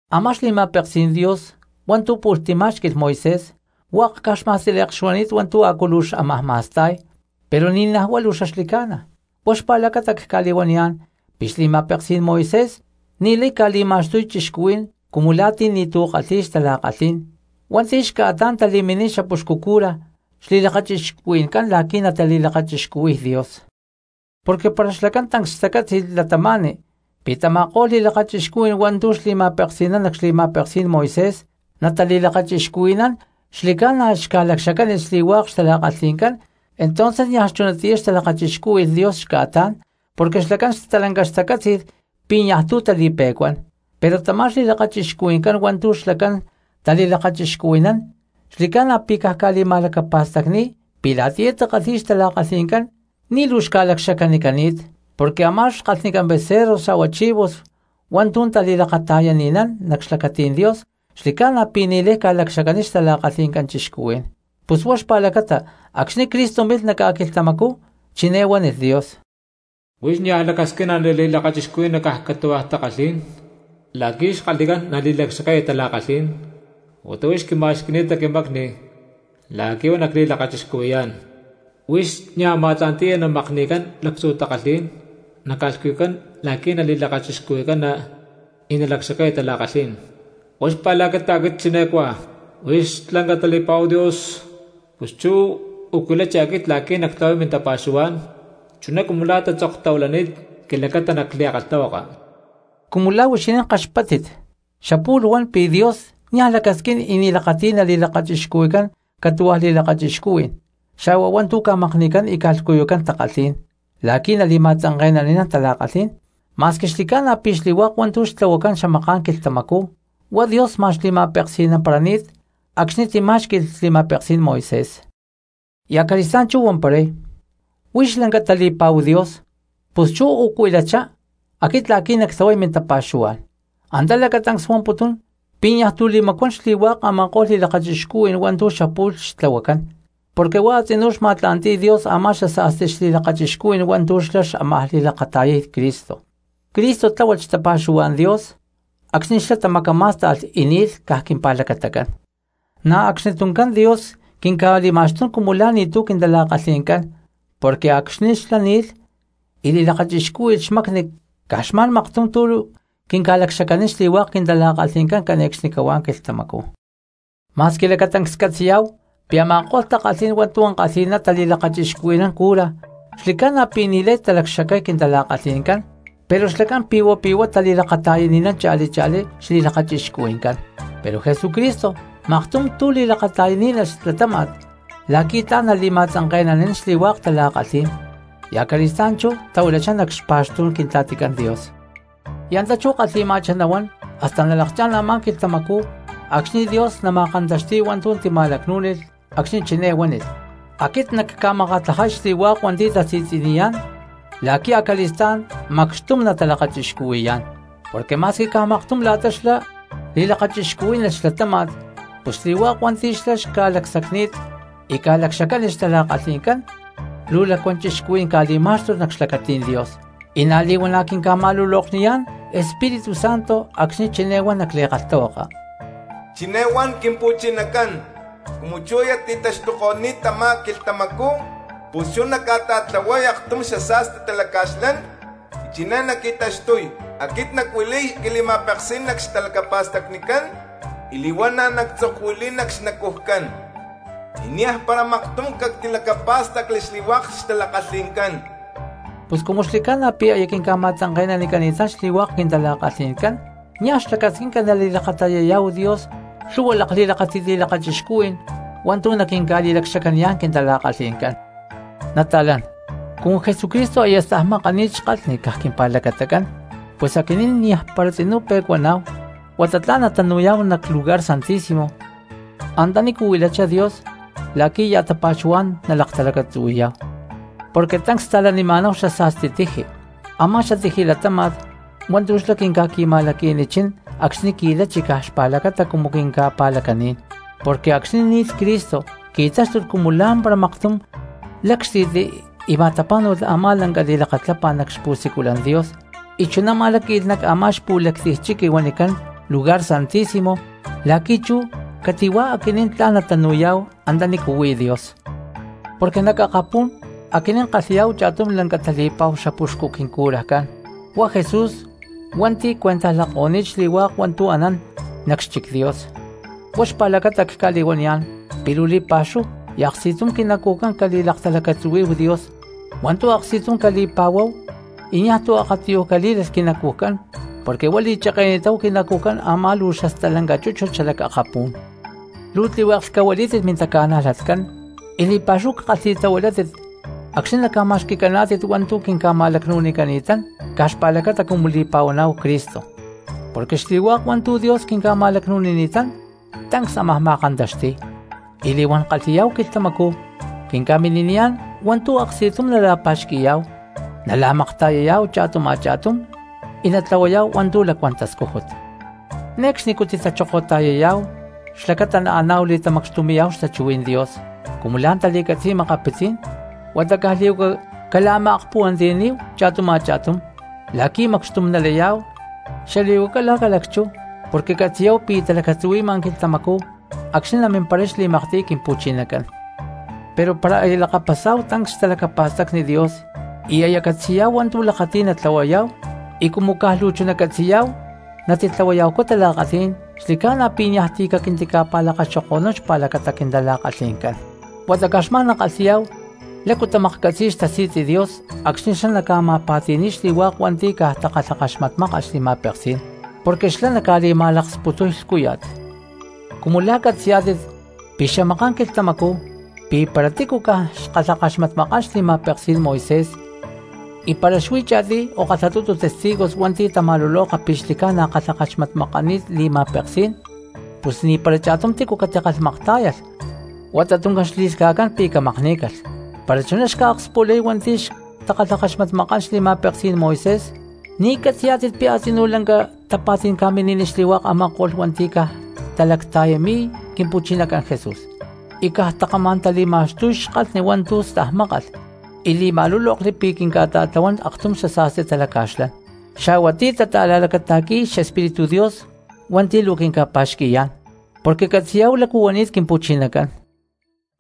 Amá xli̠ma̠peksí̠n Dios hua̠ntu̠ pu̠lh timá̠xqui̠lh Moisés, hua̠k caj xma̠stíle̠k xuani̠t hua̠ntu̠ a̠cu luu xámaj ma̠sta̠y, pero ni̠naj huá luu xaxli̠ca̠na. Huá xpa̠lacata cca̠li̠huaniyá̠n pi̠ xli̠ma̠peksí̠n Moisés ni̠lay ca̠li̠ma̠xtuy cristianos cumu la̠ ti̠ ni̠tu̠ kalhi̠y xtala̠kalhí̠n hua̠nti̠ xca̠tán tali̠miniy xapuxcu cura xli̠lakachixcuhui̠ncán la̠qui̠ natali̠lakachixcuhui̠y Dios. Porque para xlacán tancs xtacátzi̠lh cristianos pi̠ tama̠ko̠lh li̠lakachixcuhuí̠n hua̠ntu̠ xli̠ma̠peksi̠nán nac xli̠ma̠peksí̠n Moisés natali̠lakachixcuhui̠nán xli̠ca̠na xca̠lacxacánilh xli̠hua̠k xtala̠kalhi̠ncán entonces niaj chunatiyá xtalakachixcúhui̠lh Dios xca̠tán porque xlacán stalanca xtacátzi̠lh pi̠ niaj tu̠ tali̠pe̠cuán. Pero tamá xli̠lakachixcuhui̠ncán hua̠ntu̠ xca̠tán tali̠lakachixcuhui̠nán xli̠ca̠na pi̠ caj ca̠li̠ma̠lacapa̠stacni̠y pi̠ la̠tiyá takalhi̠y xtala̠kalhi̠ncán ni̠ luu xca̠lacxacanicani̠t. Porque a̠má xkalhnicán becerros xa̠hua chivos hua̠ntu̠ tali̠lakata̠yani̠nán nac xlacatí̠n Dios xli̠ca̠na pi̠ ni̠lay ca̠lacxacaniy xtala̠kalhi̠ncán cristianos. Pus huá xpa̠lacata acxni̠ Cristo milh nac ca̠quilhtamacú chiné huánilh Dios: Huix niaj lacasquina nali̠lakachixcuhui̠cana caj catu̠hua̠ takalhí̠n, la̠qui̠ xkalhnicán nali̠lacxacaya tala̠kalhí̠n, huata huix quima̠xqui̠ni̠ta quimacni la̠qui̠ huá nacli̠lakachixcuhui̠yá̠n. Huix niaj ma̠tla̠nti̠ya naca̠makni̠cán lactzu̠ takalhí̠n naca̠lhcuyucán la̠qui̠ nali̠lakachixcuhui̠cana y naca̠lacxacaya tala̠kalhí̠n. Huá xpa̠lacata aquit chiné cuá: “Huix lanca tali̠pa̠hu Dios, pus chú u̠cuilachá aquit la̠qui̠ nactlahuay mintapa̠xuhuá̠n, chuná cumu la̠ tatzoktahuilani̠t quilacata nac li̠kalhtahuaka.” Cumu la̠ huixinín kaxpáttit, xapu̠lh huan pi̠ Dios niaj lacasquín y ni̠ lakati̠y nali̠lakachixcuhui̠cán catu̠hua̠ li̠lakachixcuhuí̠n xa̠hua hua̠ntu̠ ca̠makni̠cán y ca̠lhcuyucán takalhí̠n la̠qui̠ nali̠ma̠tzanke̠nani̠nán tala̠kalhí̠n, ma̠squi xli̠ca̠na pi̠ xli̠hua̠k hua̠ntu̠ xtlahuacán xamaká̠n quilhtamacú huá Dios ma̠n xli̠ma̠peksi̠namparani̠t acxni̠ timá̠xqui̠lh xli̠ma̠peksí̠n Moisés. Y acali̠stá̠n chú huamparay: “Huix lanca tali̠pa̠hu Dios, pus chú u̠cuilachá aquit la̠qui̠ nactlahuay mintapa̠xuhuá̠n.” Antá lacatancs huamputún pi̠ niaj tu̠ tali̠macuán xli̠hua̠k a̠ma̠ko̠lh li̠lakachixcuhui̠n hua̠ntu̠ xapu̠lh xtlahuacán, porque huá a̠tzinú xma̠tla̠nti̠y Dios a̠má xasa̠sti xli̠lakchixcuhui̠n hua̠ntu̠ xlá xámaj li̠lakata̠yay Cristo. Cristo tláhualh xtapa̠xuhuá̠n Dios acxni̠ xlá tamacamá̠sta̠lh y ni̠lh caj quimpa̠lacatacán, na̠ acxni tuncán Dios quinca̠li̠ma̠xtún cumu la̠ ni̠tu̠ quintala̠kalhi̠ncán porque acxni̠ xlá ni̠lh y li̠lakachixcúhui̠lh xmacni caj xma̠n maktum tú quinca̠lacxacanín xli̠hua̠k quintala̠kalhi̠ncán cane̠cxnicahuá quilhtamacú. Ma̠squi lacatancs catzi̠yá̠hu pi̠ a̠ma̠ko̠lh takalhí̠n hua̠ntu̠ ankalhi̠ná tali̠lakachixcuhui̠nán cura xli̠ca̠na pi̠ ni̠lay talacxacay quintala̠kalhi̠ncán pero xlacán pi̠hua pi̠huá tali̠lakata̠yani̠nán cha̠li cha̠lí xli̠lakachixcuhui̠ncán. Pero Jesucristo maktum tu̠ li̠lakata̠yaní̠nalh xlatáma̠t la̠qui̠ tla̠n nali̠ma̠tzanke̠nani̠nán xli̠hua̠k tala̠kalhí̠n, y acali̠stá̠n chú tahuilachá nac xpa̠xtú̠n Quintla̠ticán Dios. Y antá chú kalhi̠ma̠chá nahuán hasta nalakchá̠n a̠má quilhtamacú acxni̠ Dios nama̠kantaxti̠y hua̠ntu̠ tima̠lacnú̠nilh acxni̠ chiné huánilh: “Aquit nacca̠makatlajay xli̠hua̠k hua̠nti̠ tasi̠tzi̠niyá̠n la̠qui̠ acali̠stá̠n macxtum natalakachixcuhui̠yá̠n.” Porque ma̠squi caj maktum la̠ta xlá li̠lakachixcuhuí̠nalh xlatáma̠t, pus xli̠hua̠k hua̠nti̠ xlá xca̠lacsacni̠t y ca̠lacxacánilh xtala̠kalhi̠ncán luu lacuán cristianos ca̠li̠má̠xtulh nac xlacatí̠n Dios. Y na̠ li̠huana̠ quinca̠ma̠lulokniyá̠n Espíritu Santo acxni̠ chiné huan nac li̠kalhtahuaka: Chiné huán Quimpu̠chinacán: Cumu chú aya ti̠taxtuko̠ni̠t tamá quilhtamacú, pus chú nacca̠ta̠tlahuay aktum xasa̠sti talaca̠xlán, y chiné naqui̠taxtuy: Aquit nacuili̠y quili̠ma̠peksí̠n nac xtalacapa̠stacnicán y li̠huana̠ nactzokuili̠y nac xnacujcán. Y niaj para maktum cactilacapá̠stacli xli̠hua̠k xtala̠kalhi̠ncán. Pus cumu xli̠ca̠na pi̠ aya quinca̠ma̠tzanke̠nanicani̠tán xli̠hua̠k quintala̠kalhi̠ncán niaj xlacasquinca nali̠lakata̠yaniyá̠w Dios lhu̠hua xali̠maakxtakájni̠t li̠lakachixcuhui̠n hua̠ntu̠ nali̠lacxacaputuná̠hu quintala̠kalhi̠ncán. Nata̠lán, cumu Jesucristo aya stajmakani̠t xkalhni caj quimpa̠lacatacán pus aquinín niajpara tzinú pe̠cuaná̠hu huata tla̠n natanu̠yá̠hu nac Lugar Santísimo antanícu huilachá Dios la̠qui̠ ya̠ tapa̠xuhuá̠n nalaktalacatzuhui̠yá̠hu. Porque tancs sta̠lanima̠náhu xasa̠sti tiji, a̠má xatiji latáma̠t hua̠ntu̠ xlá quinca̠qui̠ma̠laqui̠nichín acxni̠ qui̠lachi caj xpa̠lacata cumu quinca̠pa̠lacaní̠n, porque acxni̠ ni̠lh Cristo qui̠táxtulh cumu lá̠mpara maktum lácxti̠tli y ma̠tapá̠nu̠lh a̠má lanca li̠lakatlapá̠n nac xpu̠siculan Dios y chuná ma̠láqui̠lh nac a̠má xpu̠lactiy chiqui huanicán Lugar Santísimo la̠qui̠ chú cati̠huá aquinín tla̠n natanu̠yá̠hu antanícu huí Dios. Porque nac akapú̠n aquinín kalhi̠yá̠hu cha̠tum lanca tali̠pa̠hu xapuxcu quincurajcán huá Jesús hua̠nti̠ cuentajlako̠ni̠t xli̠hua̠k hua̠ntu̠ anán nac xchic Dios. Huá xpa̠lacata cca̠li̠huaniyá̠n pi̠ luu li̠pa̠xúhu y aksti̠tum quinacujcán cali̠laktalacatzuhuí̠hu Dios, hua̠ntu̠ aksti̠tum cali̠pa̠huáhu y niaj tu̠ akatiyuj calí̠lalh quinacujcán porque huá li̠cheke̠ni̠táhu quinacujcán ama luu xastalanca chúchut xalac akapú̠n. Luu tlihueklh cahuilí̠tit mintaca̠najlatcán y li̠pa̠xúhu cakalhi̠tahuilátit acxni̠ naca̠ma̠xqui̠caná̠tit hua̠ntu̠ quinca̠ma̠lacnu̠nicani̠tán caj xpa̠lacata cumu li̠pa̠huaná̠hu Cristo; porque xli̠hua̠k hua̠ntu̠ Dios quinca̠ma̠lacnu̠nini̠tán tancs ámaj ma̠kantaxti̠y. Y li̠huán kalhi̠yá̠hu quilhtamacú quinca̠mini̠niyá̠n hua̠ntu̠ aksti̠tum nala̠pa̠xqui̠yá̠hu, nala̠makta̠yayá̠hu cha̠tum a̠cha̠túm y natlahuayá̠hu hua̠ntu̠ lacuán tascújut. Ne̠cxnicú titachokota̠yayá̠hu xlacata naaná̠hu li̠tamacxtumi̠yá̠hu xtachuhuí̠n Dios cumu la̠ tali̠catzi̠y makapitzí̠n, huata caj li̠huaca cala̠ma̠akpuhuantiyaní̠hu cha̠tum a̠cha̠tum la̠qui̠ macxtum nalayá̠hu, xali̠huaca la̠ ca̠lacchú porque catzi̠yá̠hu pi̠ talacatzuhui̠ma quilhtamacú acxni̠ namimparay xli̠maktiy Quimpu̠chinacán. Pero para aya lakapasá̠hu tancs xtalacapa̠stacni Dios y aya catzi̠yá̠hu hua̠ntu̠ lakati̠y natlahuayá̠hu, y cumu caj luu chuná catzi̠yá̠hu natitlahuaya̠hucú tala̠kalhí̠n, xli̠ca̠na pi̠ niaj ti̠ caquintica̠pa̠lakaxoko̠nún xpa̠lacata quintala̠kalhi̠ncán. Huata caj xma̠n nakalhi̠yá̠hu lácu tamaklhcatzi̠y xtasi̠tzi Dios acxni̠ xlá naca̠ma̠pa̠ti̠ni̠y xli̠hua̠k hua̠nti̠ caj takalhakaxmatmákalh xli̠ma̠peksí̠n, porque xlá naca̠li̠ma̠laksputuy lhcúya̠t. Cumu la̠ catzi̠yá̠tit pi̠ xamaká̠n quilhtamacú pi̠ para tícu caj xkalhakaxmatmakán xli̠ma̠peksí̠n Moisés y para xuí cha̠tiy o kalhatutu testigos hua̠nti̠ tama̠luloka pi̠ xli̠ca̠na kalhakaxmatmakani̠t li̠ma̠peksí̠n pus ni̠para cha̠tum tícu catikalhmaktá̠yalh huata tuncán xli̠lhca̠cán pi̠ camakní̠calh. Para chuná xca̠akspulay hua̠nti̠ xtakalhakaxmatmakán xli̠ma̠peksí̠n Moisés, ¿ni catzi̠yá̠tit pi̠ a̠tzinú lanca tapa̠tí̠n ca̠mini̠niy xli̠hua̠k a̠ma̠ko̠lh hua̠nti̠ caj talacta̠yami̠y Quimpu̠chinacán Jesús y caj takamá̠n tali̠ma̠xtuy xkalhni hua̠ntu̠ stajmákalh y li̠ma̠lúlokli pi̠ quinca̠ta̠tlahuán aktum xasa̠sti talaca̠xlán, xa̠hua ti̠ tata̠la̠lacata̠qui̠y xEspíritu Dios hua̠nti̠ luu quinca̠pa̠xqui̠yá̠n? Porque catzi̠yá̠hu lácu huani̠t Quimpu̠chinacán: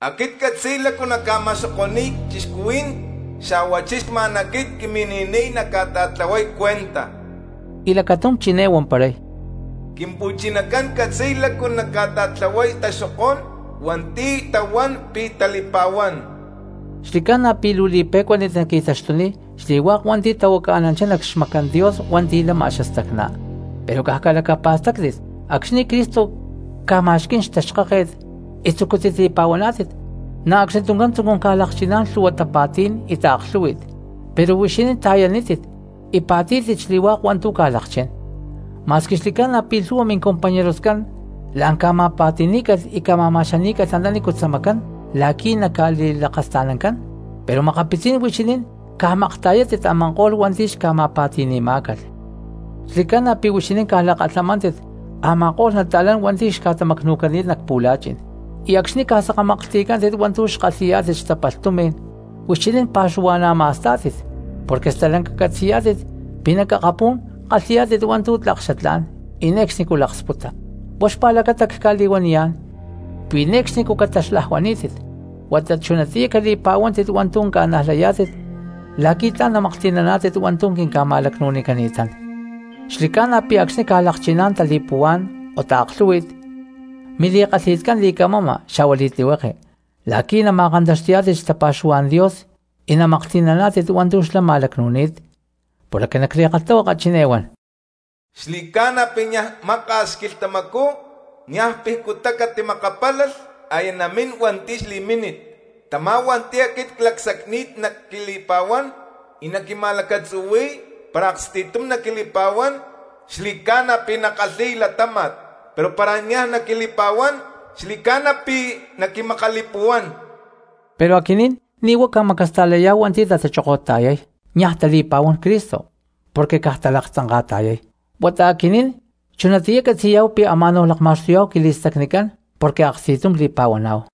“Aquit ccatzi̠y lácu nacca̠ma̠xoko̠ni̠y cristianos, xa̠huachí xma̠n aquit quimini̠niy nacca̠ta̠tlahuay cuentaj.” Y lacatum chiné huamparay: “Quimpu̠chinacán catzi̠y lácu naca̠ta̠tlahuay taxokó̠n hua̠nti̠ tahuán pi̠ tali̠pa̠huán.” ¡Xli̠ca̠na pi̠ luu li̠pe̠cuánit naqui̠taxtuniy xli̠hua̠k hua̠nti̠ tahuacananchá nac xmacán Dios hua̠nti̠ lama xastacná! Pero caj calacapa̠stáctit acxni̠ Cristo ca̠ma̠xquí̠n xtaxkáket y tzucútit li̠pa̠huaná̠tit, na̠ acxni tuncán tzucún ca̠lakchiná̠n lhu̠hua tapa̠tí̠n y taaklhú̠hui̠t, pero huixinín ta̠yanítit y pa̠tí̠tit xli̠hua̠k hua̠ntu̠ ca̠lakchín. Ma̠squi xli̠ca̠na pi̠ lhu̠hua mincompañeroscán la̠n ca̠ma̠pa̠ti̠ní̠calh y ca̠ma̠ma̠xaní̠calh antanícu tzamacán la̠qui̠ naca̠li̠lakasta̠nancán, pero makapitzí̠n huixinín ca̠makta̠yátit a̠ma̠ko̠lh hua̠nti̠ xca̠ma̠pa̠ti̠ni̠má̠calh. Xli̠ca̠na pi̠ huixinín ca̠lakalhamántit a̠ma̠ko̠lh cristianos hua̠nti̠ xca̠tamacnu̠cani̠t nac pu̠la̠chi̠n, y acxni̠ ca̠sakamaklhti̠cántit hua̠ntu̠ xkalhi̠yá̠tit xtapalh tumi̠n huixinín pa̠xuhua̠na̠ ma̠stá̠tit, porque stalanca catzi̠yá̠tit pi̠ nac akapú̠n kalhi̠yá̠tit hua̠ntu̠ tlak xatlá̠n y ne̠cxnicú laksputa. Huá xpa̠lacata cca̠li̠huaniyá̠n pi̠ ne̠cxnicú cataxlajuaní̠tit huata chunatiyá cali̠pa̠huántit hua̠ntu̠ ca̠najlayá̠tit la̠qui̠ tla̠n namaklhti̠naná̠tit hua̠ntu̠ quinca̠ma̠lacnu̠nicani̠tán. Xli̠ca̠na pi̠ acxni̠ ca̠lakchiná̠n tali̠puhuá̠n o taaklhú̠hui̠t mili̠kalhi̠tcán li̠camama xa̠hua li̠tlihueke la̠qui̠ nama̠kantaxti̠yá̠tit xtapa̠xuhuá̠n Dios y namaklhti̠naná̠tit hua̠ntu̠ xlá ma̠lacnu̠ni̠t. Porque nac li̠kalhtahuaka chiné huán: Xli̠ca̠na pi̠ niaj maka̠s quilhtamacú, niaj picutá catimakapálalh, aya namín hua̠nti̠ xli̠mínit. Tamá hua̠nti̠ aquit clacsacni̠t naquili̠pa̠huán y naquima̠lacatzuhui̠y, para aksti̠tum naquili̠pa̠huán xli̠ca̠na pi̠ nakalhi̠y latáma̠t; pero para niaj naquili̠pa̠huán xli̠ca̠na pi̠ naquimakali̠puhuán. Pero aquinín ni̠ huá ca̠macasta̠layá̠hu hua̠nti̠ tatachokota̠yay niaj tali̠pa̠huán Cristo porque caj talaktzanka̠ta̠yay, huata aquinín chunatiyá catzi̠yá̠hu pi̠ ama̠náhu lakma̠xtuyá̠hu quili̠stacnicán porque aksti̠tum li̠pa̠huaná̠hu.